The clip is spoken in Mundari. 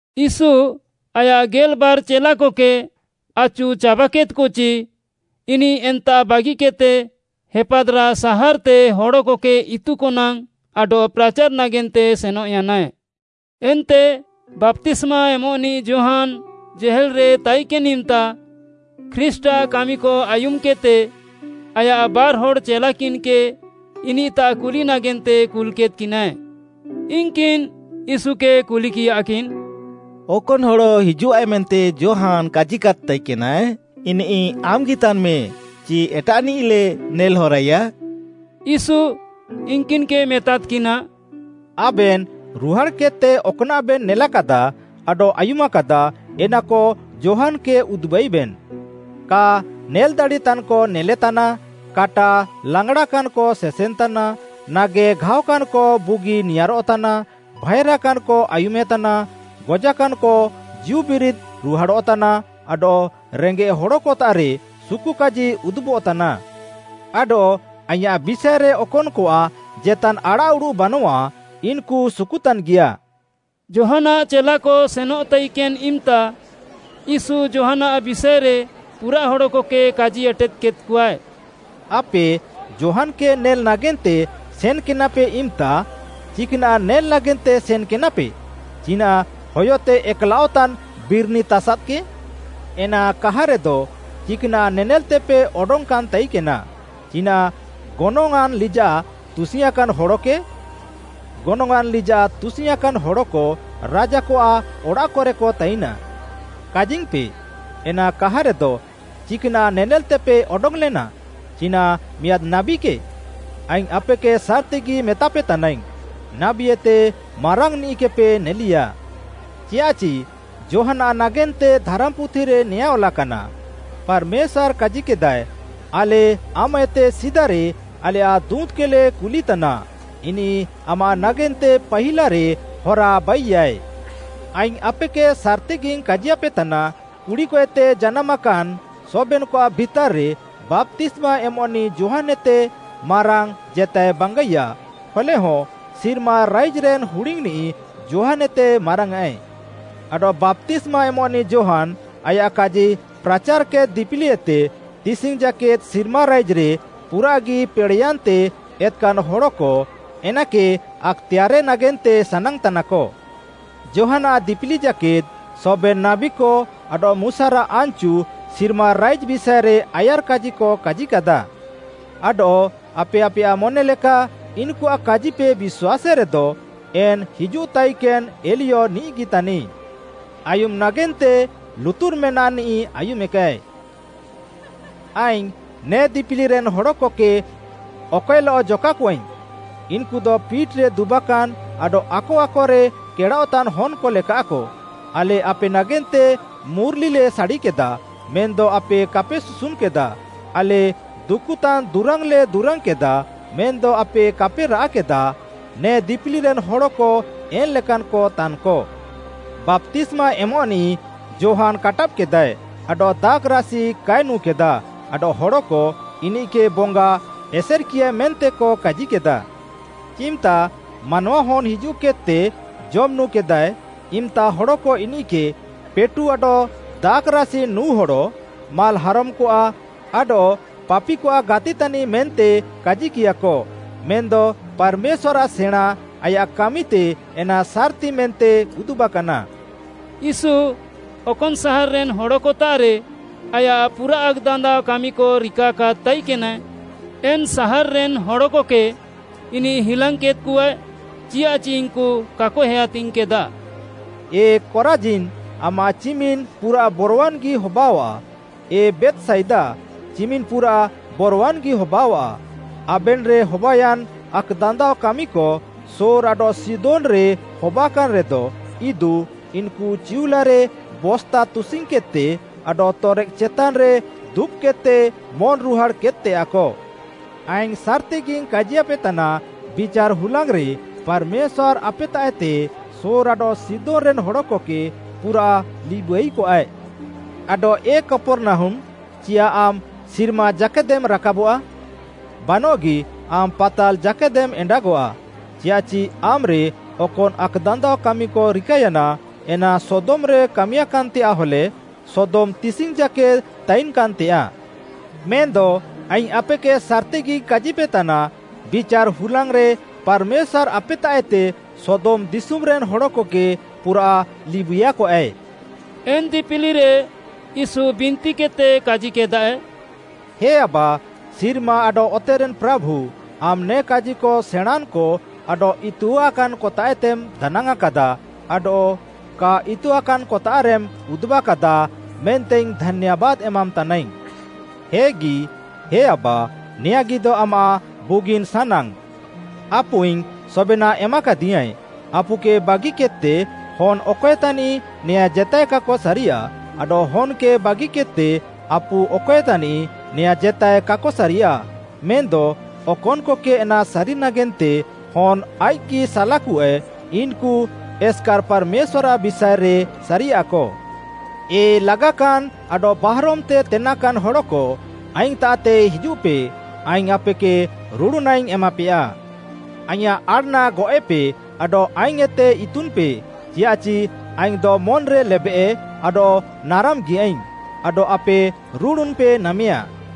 ୟୀଶୁ ଆୟାଃ ଗେଲ୍‌ବାର୍‌ ଚେଲାକକେ ଆଚୁ ଚାବାକେଦ୍‌କଚି, ଇନିଃ ଏନ୍ତାଃ ବାଗିକେଦ୍‌ତେ ହେପାଦ୍‌ରାଃ ସାହାର୍‌ତେ ହଡ଼କକେ ଇତୁକ ନାଙ୍ଗ୍‌ ଆଡଃ ପ୍ରାଚାର୍‌ ନାଗେନ୍ତେ ସେନଃୟାନାଏ। ଏନ୍ତେ ବାପ୍ତିସ୍ମା ଏମଃନିଃ ଯୋହାନ୍‌ ଜେହେଲ୍‌ରେ ତାଇକେନ୍‌ ଇମ୍‌ତା ଖ୍ରୀଷ୍ଟ୍‌ଆଃ କାମିକ ଆୟୁମ୍‌କେଦ୍‌ତେ, ଆୟାଃ ବାର୍‌ହଡ଼୍‌ ଚେଲାକିନ୍‌କେ ଇନିଃତାଃ କୁଲି ନାଗେନ୍ତେ କୁଲ୍‌କେଦ୍‌କିନାଏ। ଇନ୍‌କିନ୍‌ ୟୀଶୁକେ କୁଲିକିୟାକିନ୍, “ଅକନ୍‌ ହଡ଼ ହିଜୁଃଆଏ ମେନ୍ତେ ଯୋହାନ୍‌ କାଜିକାଦ୍‌ ତାଇକେନାଏ, ଇନିଃ ଆମ୍‌ଗି ତାନ୍‌ମେ ଚି ଏଟାଃନିଃଲେ ନେଲ୍‌ହରାଇୟା?” ୟୀଶୁ ଇନ୍‌କିନ୍‌କେ ମେତାଦ୍‌କିନା, “ଆବେନ୍‌ ରୁହାଡ଼୍‌କେଦ୍‌ତେ ଅକ୍‌ନାଃବେନ୍‌ ନେଲାକାଦା ଆଡଃ ଆୟୁମାକାଦା ଏନାକ ଯୋହାନ୍‌କେ ଉଦୁବାଇବେନ୍‌। କା ନେଲ୍‌ଦାଡ଼ିତାନ୍‌କ ନେଲେତାନା, କାଟା ଲେଙ୍ଗ୍‌ଡ଼ାକାନ୍‌କ ସେସେନ୍‌ତାନା, ନାଗେଘାଅକାନ୍‌କ ବୁଗି ନିଆଁରଃତାନା, ଭାଏଁରାକାନ୍‌କ ଆୟୁମେତାନା, ଗଜାକାନ୍‌କ ଜୀଉବିରିଦ୍‌ ରୁହାଡ଼ଃତାନା, ଆଡଃ ରେଙ୍ଗେଃ ହଡ଼କତାଃରେ ସୁକୁକାଜି ଉଦୁବଃତାନା। ଆଡଃ ଆଇଁୟାଃ ବିଷାଏରେ ଅକନ୍‌କଆଃ ଜେତାନ୍‌ ଆଡ଼ାଃଉଡ଼ୁଃ ବାନଃଆ, ଇନ୍‌କୁ ସୁକୁତାନ୍‌ଗିୟା।” ଯୋହାନ୍‌ଆଃ ଚେଲାକ ସେନଃ ତାଇକେନ୍‌ ଇମ୍‌ତା ୟୀଶୁ ଯୋହାନ୍‌ଆଃ ବିଷାଏରେ ପୁରାଃ ହଡ଼କକେ କାଜି ଏଟେଦ୍‌କେଦ୍‌ଆଏ, “ଆପେ ଯୋହାନ୍‌କେ ନେଲ୍‌ ନାଗେନ୍ତେ ସେନ୍‌କେନାପେ ଇମ୍‌ତା, ଚିକ୍‌ନାଃ ନେଲ୍‌ ନାଗେନ୍ତେ ସେନ୍‌କେନାପେ? ଚିନାଃ ହୟତେ ଏକ୍‌ଲାଅଃତାନ୍‌ ବିର୍‌ନି ତାସାଦ୍‌କେ? ‌ ଏନା କାହାରେଦ ଚିକ୍‌ନାଃ ନେନେଲ୍‌ତେପେ ଅଡଙ୍ଗ୍‌କାନ୍‌ ତାଇକେନା। ଚିନାଃ ଗନଙ୍ଗ୍‌ଆଁନ୍‌ ଲିଜାଃ ତୁସିଙ୍ଗ୍‌ଆଁକାନ୍‌ ହଡ଼କେ? ଗନଙ୍ଗ୍‌ଆଁନ୍‌ ଲିଜାଃ ତୁସିଙ୍ଗ୍‌ଆଁକାନ୍‌ ହଡ଼କ ରାଜାକଆଃ ଅଡ଼ାଃକରେକ ତାଇନାଃ। କାଜିଙ୍ଗ୍‌ପେ, ଏନା କାହାରେଦ, ଚିକ୍‌ନାଃ ନେନେଲ୍‌ତେପେ ଅଡଙ୍ଗ୍‌ଲେନା? ଚିନାଃ ମିଆଁଦ୍‌ ନାବୀକେ? ଆଇଙ୍ଗ୍‌ ଆପେକେ ସାର୍‌ତିଗି ମେତାପେ ତାନାଇଙ୍ଗ୍‌, ନାବୀଏତେ ମାରାଙ୍ଗ୍‌ନିଃକେପେ ନେଲିୟା। ଚିୟାଃଚି ଯୋହାନ୍‌ଆଃ ନାଗେନ୍ତେ ଧାରାମ୍‌ପୁଥିରେ ନେଆଁଁ ଅଲାକାନା, ‘ପାର୍‌ମେଶ୍ୱାର୍‌ କାଜିକେଦାଏ, ଆଲେ ଆମାଃଏତେ ସିଦାରେ ଆଲେୟାଃ ଦୁଁତ୍‌କେଲେ କୁଲିତାନା ଇନିଃ ଆମାଃ ନାଗେନ୍ତେ ପାହିଲାରେ ହରା ବାଇୟାଏ।’ ଆଇଙ୍ଗ୍‌ ଆପେକେ ସାର୍‌ତିଗିଙ୍ଗ୍‌ କାଜିୟାପେତାନା, କୁଡ଼ିକଏତେ ଜାନାମାକାନ୍‌ ସବେନ୍‌କଆଃ ଭିତାର୍‌ରେ ବାପ୍ତିସ୍ମା ଏମଃନିଃ ଯୋହାନ୍‌ଏତେ ମାରାଙ୍ଗ୍‌ ଜେତାଏ ବାଙ୍ଗାଇୟା, ହଲେହଁ ସିର୍ମା ରାଇଜ୍‌ରେନ୍‌ ହୁଡିଙ୍ଗ୍‌ନିଃ ଯୋହାନ୍‌ଏତେ ମାରାଙ୍ଗ୍‌ଆଏ। ଆଡଃ ବାପ୍ତିସ୍ମା ଏମଃନିଃ ଯୋହାନ୍‌ ଆୟାଃ କାଜି ପ୍ରାଚାର୍‌କେଦ୍‌ ଦିପିଲିଏତେ ତିସିଙ୍ଗ୍‌ ଜାକେଦ୍‌ ସିର୍ମା ରାଇଜ୍‌ରେ ପୁରାଃଗି ପେଡ଼େୟାନ୍‌ତେ ଏତ୍‌କାନ୍‌ ହଡ଼କ ଏନାକେ ଆକ୍‌ତେୟାର୍‌ରେ ନାଗେନ୍ତେ ସାନାଙ୍ଗ୍‌ ତାନାକ। ଯୋହାନ୍‌ଆଃ ଦିପିଲି ଜାକେଦ୍‌ ସବେନ୍‌ ନାବୀକ ଆଡଃ ମୁଶାରାଃ ଆନ୍‌ଚୁ ସିର୍ମା ରାଇଜ୍‌ ବିଷାଏରେ ଆୟାର୍‌କାଜିକ କାଜିକାଦା। ଆଡଃ ଆପେ ଆପେୟାଃ ମନେଲେକା ଇନ୍‌କୁଆଃ କାଜିପେ ବିଶ୍ୱାସେରେଦ, ଏନ୍‌ ହିଜୁଃତାଇକେନ୍‌ ଏଲିୟ ନିଃଗି ତାନିଃ। ଆୟୁମ୍‌ ନାଗେନ୍ତେ ଲୁତୁର୍‌ ମେନାଃନିଃ ଆୟୁମେକାଏ। “ଆଇଙ୍ଗ୍‌ ନେ ଦିପିଲିରେନ୍‌ ହଡ଼କକେ ଅକଏଲଃ ଜକାକଆଇଙ୍ଗ୍‌? ଇନ୍‌କୁଦ ପିଟ୍‌ରେ ଦୁବାକାନ୍‌ ଆଡଃ ଆକ ଆକରେ କେଡ଼ାଅଃତାନ୍‌ ହନ୍‌କ ଲେକାଃକ, ‘ଆଲେ ଆପେ ନାଗେନ୍ତେ ମୁର୍‌ଲିଲେ ସାଡ଼ିକେଦା, ମେନ୍‌ଦ ଆପେ କାପେ ସୁସୁନ୍‌କେଦାଃ, ଆଲେ ଦୁକୁତାନ୍‌ ଦୁରାଙ୍ଗ୍‌ଲେ ଦୁରାଙ୍ଗ୍‌କେଦାଃ ମେନ୍‌ଦ ଆପେ କାପେ ରାଆଃ କେଦାଃ।’ ନେ ଦିପିଲିରେନ୍‌ ହଡ଼କ ଏନ୍‌ ଲେକାନ୍‌କ ତାନ୍‌କ। ବାପ୍ତିସ୍ମା ଏମଃନିଃ ଯୋହାନ୍‌ କାଟାବ୍‌କେଦାଏ ଆଡଃ ଦାଖ୍‌ରାସି କାଏ ନୁଁ କେଦାଃ, ଆଡଃ ହଡ଼କ ‘ଇନିଃକେ ବଙ୍ଗା ଏସେର୍‌କିୟାଏ’ ମେନ୍ତେକ କାଜିକେଦା। ଚିମ୍‌ତା ମାନୱାହନ୍‌ ହିଜୁଃକେଦ୍‌ତେ ଜମ୍‌ ନୁଁ କେଦାଏ, ଇମ୍‌ତା ହଡ଼କ ଇନିଃକେ ‘ପେଟୁ ଆଡଃ ଦାଖ୍‌ରାସି ନୁଁ ହଡ଼, ମାଲ୍‌ହାରମ୍‌କଆଃ ଆଡଃ ପାପିକଆଃ ଗାତି ତାନିଃ’ କାଜିକିୟାକ। ମେନ୍‌ଦ ପାର୍‌ମେଶ୍ୱାର୍‌ଆଃ ସେଣାଁଁ ଆୟାଃ କାମିତେ ଏନା ସାର୍‌ତି ମେନ୍ତେ ଉଦୁବାକାନା।” ୟୀଶୁ ଅକନ୍‌ ସାହାର୍‌ରେନ୍‌ ହଡ଼କତାଃରେ ଆୟାଃ ପୁରାଃ ଆକ୍‌ଦାନ୍ଦାଅ କାମିକ ରିକାକାଦ୍‌ ତାଇକେନାଏ, ଏନ୍‌ ସାହାର୍‌ରେନ୍‌ ହଡ଼କକେ ଇନିଃ ହିଲାଙ୍ଗ୍‌କେଦ୍‌କଆଏ, ଚିୟାଃଚି ଇନ୍‌କୁ କାକ ହେୟାତିଙ୍ଗ୍‌କେଦା। “ଏ କରାଜିନ୍, ଆମାଃ ଚିମିନ୍‌ ପୁରାଃ ବରୱାନ୍‌ଗି ହବାଅଃଆ, ଏ ବେଥ୍‌ସାଇଦା, ଚିମିନ୍‌ ପୁରାଃ ବରୱାନ୍‌ଗି ହବାଅଃଆ, ଆବେନ୍‌ରେ ହବାୟାନ୍ ଆକ୍‌ଦାନ୍ଦାଅ କାମିକ ସୋର୍‌ ଆଡଃ ସିଦୋନ୍‌ରେ ହବାକାନ୍‌ରେଦ, ଇଦୁ ଇନ୍‌କୁ ଚିଉଲାରେ ବସ୍ତା ତୁସିଙ୍ଗ୍‌କେଦ୍‌ତେ ଆଡଃ ତରେକ୍‌ ଚେତାନ୍‌ରେ ଦୁବ୍‌କେଦ୍‌ତେ ମନ୍‌ରୁହାଡ଼୍‌ କେଦ୍‌ତେୟାଃକ। ଆଇଙ୍ଗ୍‌ ସାର୍‌ତିଗିଙ୍ଗ୍‌ କାଜିୟାପେତାନା, ବିଚାର୍‌ ହୁଲାଙ୍ଗ୍‌ରେ ପାର୍‌ମେଶ୍ୱାର୍‌ ଆପେତାଃଏତେ ସୋର୍‌ ଆଡଃ ସିଦୋନ୍‌ରେନ୍‌ ହଡ଼କକେ ପୁରାଃ ଲିବୁଇୟାକଆଏ। ଆଡଃ ଏ କପର୍‌ନାହୁମ୍‌, ଚିୟାଃ ଆମ୍‌ ସିର୍ମା ଜାକେଦେମ୍ ରାକାବଆଃ? ବାନଃଗି ଆମ୍‌ ପାତାଲ୍‌ ଜାକେଦେମ୍ ଏଣ୍ଡାଗଆଃ। ଚିୟାଃଚି ଆମ୍‌ରେ ଅକନ୍‌ ଆକ୍‌ଦାନ୍ଦାଅ କାମିକ ରିକାୟାନା, ଏନା ସଦୋମ୍‌ରେ କାମିୟାକାନ୍‌ତେୟାଃ ହଲେ ସୋଦମ୍‌ ତିସିଙ୍ଗ୍‌ ଜାକେଦ୍‌ ତାଇନ୍‌କାନ୍‌ତେୟାଃ। ମେନ୍‌ଦ ଆଇଙ୍ଗ୍‌ ଆପେକେ ସାର୍‌ତିଗିଙ୍ଗ୍‌ କାଜିପେତାନା, ବିଚାର୍‌ ହୁଲାଙ୍ଗ୍‌ରେ ପାର୍‌ମେଶ୍ୱାର୍‌ ଆପେତାଃଏତେ ସୋଦମ୍‌ ଦିଶୁମ୍‌ରେନ୍‌ ହଡ଼କକେ ପୁରାଃ ଲିବୁଇୟାକଆଏ।” ଏନ୍‌ ଦିପିଲିରେ ୟୀଶୁ ବିନ୍ତିକେଦ୍‌ତେ କାଜିକେଦାଏ, “ହେ ଆବା, ସିର୍ମା ଆଡଃ ଅତେରେନ୍‌ ପ୍ରାଭୁ, ଆମ୍‌ ନେ କାଜିକ ସେଣାଁଁନ୍‌କ ଆଡଃ ଇତୁଆନ୍‌କତାଃଏତେମ୍‌ ଦାନାଙ୍ଗ୍‌ଆଁଁ କାଦାଃ, ଆଡଃ କା ଇତୁଆକାନ୍‌କତାଃରେମ୍ ଉଦୁବାକାଦାଃ ମେନ୍ତେଇଙ୍ଗ୍‌ ଧାନ୍ୟାବାଦ୍‌ ଏମାମ୍‌ତାନାଇଙ୍ଗ୍‌। ହେଗି, ହେ ଆବା, ନେୟାଁଗିଦ ଆମାଃ ବୁଗିନ୍‌ ସାନାଙ୍ଗ୍‌। “ଆପୁଇଙ୍ଗ୍‌ ସବେନାଃ ଏମାକାଦିୟାଁଏ, ଆପୁକେ ବାଗିକେଦ୍‌ତେ ହନ୍‌ ଅକଏ ତାନିଃ ନେୟାଁ ଜେତାଏ କାକ ସାରିୟାଃ, ଆଡଃ ହନ୍‌କେ ବାଗିକେଦ୍‌ତେ ଆପୁ ଅକଏ ତାନିଃ ନେୟାଁ ଜେତାଏ କାକ ସାରିୟାଃ। ମେନ୍‌ଦ ଅକନ୍‌କକେ ଏନା ସାରି ନାଗେନ୍ତେ ହନ୍‌ ଆଇଃକ୍‌ଗି ସାଲାକୁଆଏ, ଇନ୍‌କୁ ଏସ୍‌କାର୍‌ ପାର୍‌ମେଶ୍ୱାର୍‌ଆଃ ବିଷାଏରେ ସାରିୟାଃକ। “ଏ ଲାଗାକାନ୍‌ ଆଡଃ ବାହାରମ୍‌ତେ ତେନାକାନ୍‌ ହଡ଼କ ଆଇଙ୍ଗ୍‌ତାଃତେ ହିଜୁଃପେ, ଆଇଙ୍ଗ୍‌ ଆପେକେ ରୁଡ଼ୁନାଇଙ୍ଗ୍‌ ଏମାପେୟା। ଆଇଁୟାଃ ଆଡ଼୍‌ନା ଗଅଃଏପେ ଆଡଃ ଆଇଙ୍ଗ୍‌ଏତେ ଇତୁନ୍‌ପେ, ଚିୟାଃଚି ଆଇଙ୍ଗ୍‌ଦ ମନ୍‌ରେ ଲେବେଃ ଆଡଃ ନାରାମ୍‌ଗିୟାଇଙ୍ଗ୍‌, ଆଡଃ ଆପେ ରୁଡ଼ୁନ୍‌ପେ ନାମେୟା।